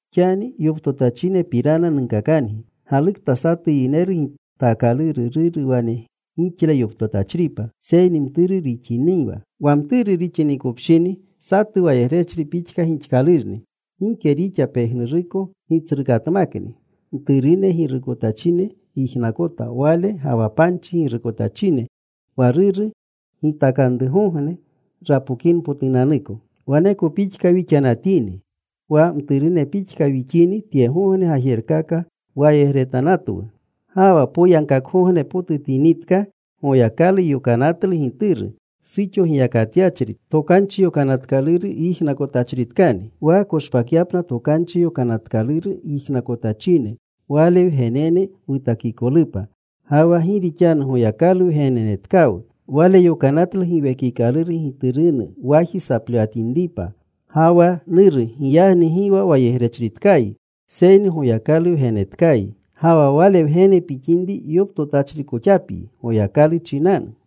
Xani yoptotachinepapirana nunkakangi. Galukta satu yineru gitaakaluru ruru wane gixle yoptotachripa, seyni mturu rixiniwa. Wa mturu rixinikopshini, satu wayegrechri pixka gixkalurni. Gike rixa pejnuruko gitsrukatmakni. Mturune girukotachine yijnakota wale ga wa panchi girukotachine, wa ruru gitakanrugogne rapokinpotunanuko. Waneko pixka wixanatini. Wa mturune pixka wixini tyegogne gajerkaka wayegretanatwu. Ga wa poyagkakgognepotutinitka, Goyakalu yokanatlu Gituru, suxo giyakatyachri, Tokanchi Yokanatkaluru yijnakotachritkani, wa koshpakyapna Tokanchi Yokanatkaluru yijnakonatachine, Wale wgenene wutakikolupa. Ga wa gi rixanu Goyakalu wgennetkawu, Wale yokanatlu Giwekikaluru Giturunu waji saplewatinripa, “Gawwa.” (Nuru.) Giyagni gi wa wayegrechritkayi, seyni Goyakalu wgenetkayi. Ga wa Wale wgene pixinri yoptotachrikoxapyi Goyakalu chinanu.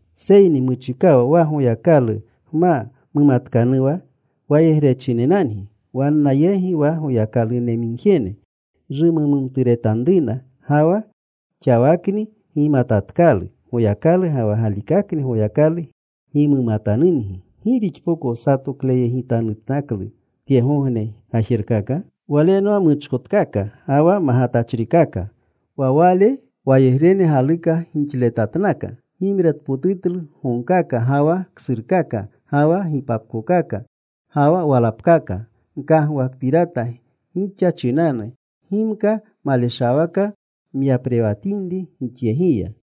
Seyni muchikawa wa Goyakalu gma mumatkanuwa, wayegrechinenangi wanna yegi wa goyakalunemigjene rumumturetanruna. Ga wa xawakni gimatatkalu Goyakalu, ga wa galikakni Goyakalu gimatanungi. ¿Gi gixpoko satokleyegitanutnaklu tyegogne gajerkaka? Walenwa muchkotkaka ga wa magatachrikaka. Wa wale wayegrene galuka gixletatnaka. Gimretpotutlu gogkaka, ga wa ksurkaka, ga wa gipapkokaka, ga wa walapkaka. Nkagwakpirata gixa chinanu gimka maleshawaka nyaprewanatinri gixyegiya.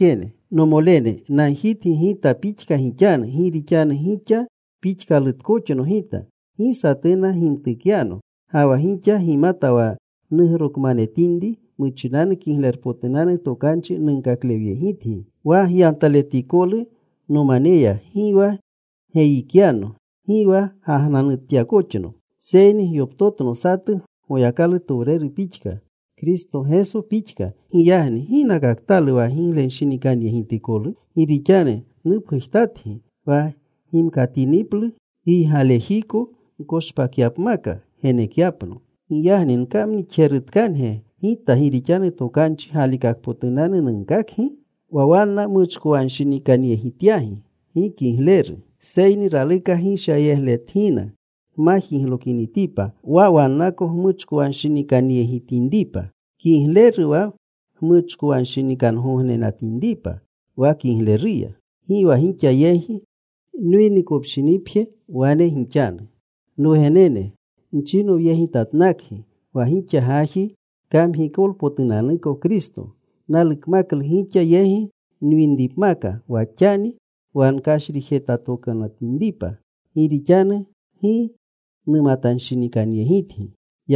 Nomolene, nagjitgi gita pixka gixanu gi rixanu gixa pixkalutkoxno gita. Gi satuna gimtukyano. Ga wa gixa gimata wa nugrokmanetinri muchinanu Kiglerpotunanu Tokanchi nunkaklewyegitgi. Wa gyantaletikolu nomaneya, gi wa geyikyano. Gi wa gagnanutyakoxno. Seyni gyoptotno satu Goyakalutowreru pixka, Kristo Geso pixka. Giyagni ¿ginakatkalu wa giglenshinikanyegitikolu? Gi rixanu nupgujtatgi wa gimkatiniplu giygalejiko gkoshpakyapmaka genekyapno. Giyagni ¿gkamnixjerutkange gita gi rixanu tokanchi galikakpotunanu nunkakgi? Wa wanna muchkowanshinikanyegityagi gi kigleru. Seyni raluka gishyayegletgina gma jiglokinitipa, wa wannako gmuchkowanshinikanyegitinripa. Kigleru wa gmuchkowanshinikangognenatinripa wa kigleruya. Gi wa gixa yegi nwinikopshinipje wane gixanu. Nwugenene, nchinowyegitatnakgi wa gixa gaji kamgikolpotunanuko Kristo. Nalukmaklu gixa yegi nwinripmaka wa xani wa nkashrijetokanutinripa, gi rixanu gi numatanshinikanyegitgi.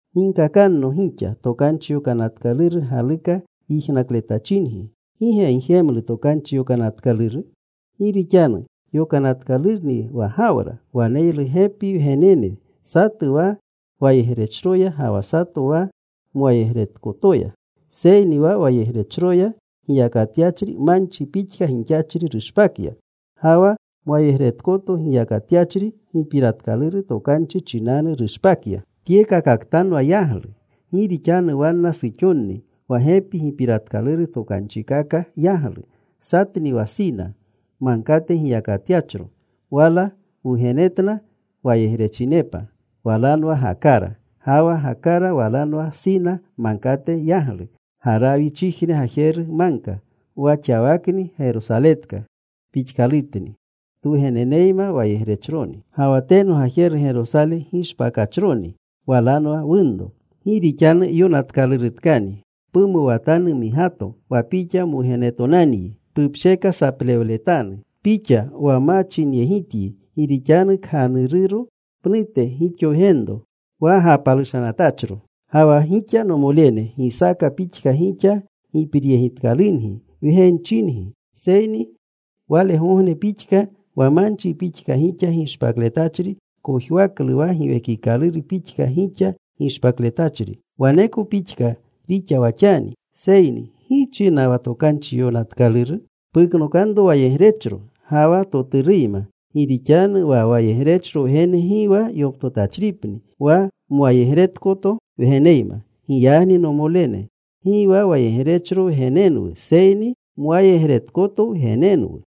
Ginkakanno, gixa Tokanchi Yokanatkaluru galuka yijnakletachingi, ¿gi ge gjemlu Tokanchi Yokanatkaluru? Gi rixanu yonatkalurni wa Gawra waneylu gepi wgenene. Satu wa wayegrechroya, ga wa satu wa mwayegretkotoya. Seyni wa wayegrechroya giyakatyachri manchi pixka gixachri rushpakya. Ga wa mwayegretkoto giyakatyachri gipiratkaluru tokanchi chinanu rushpakya. Tyekakaktanwa yaglu. Gi rixanu wanna suxonni wa gepi gipiratkaluru tokanchikaka yaglu. Satni wa Sina Magkate giyakatyachro. Wala wugenetna wayegrechinepa. Walanwa Gakara. Ga wa Gakara walanwa Sina Magkate yaglu. Garawichijne gajeru magka. Wa xawakni Gerosaletka pixkalutni, twugeneneyma wayegrechroni. Ga wa teno gajeru Gerosale gishpakachroni, walanwa wunro. Gi rixanu yonatkalurutkani: Pumuwatanu, migato, wa pixa mwugenetonanyi. Pupsheka saplewletanu, pixa wa ma chinyegityi. Gi rixanu kganururo pnute gixo wgenro wa gapalushanatachro. Ga wa gixa, nomolene, Gisaaka pixka gixa gipiryegitkalungi wgenchingi. Seyni walegogne pixka wa manchi pixka gixa gishpakletachri kojwaklu wa Giwekikaluru pixka gixa gishpakletachri, waneko pixka rixa wa xani. Seyni ¿gi china wa tokanchi yonatkaluru? “Puknokanro wayegrechro ga wa toturuyma. Gi rixanu wa wayegrechro wgene gi wa yoptotachripni wa mwayegretkoto wgeneyma.” Giyagni, nomolene, gi wa wayegrechro wgenenwu, seyni mwayegretkoto wgenenwu.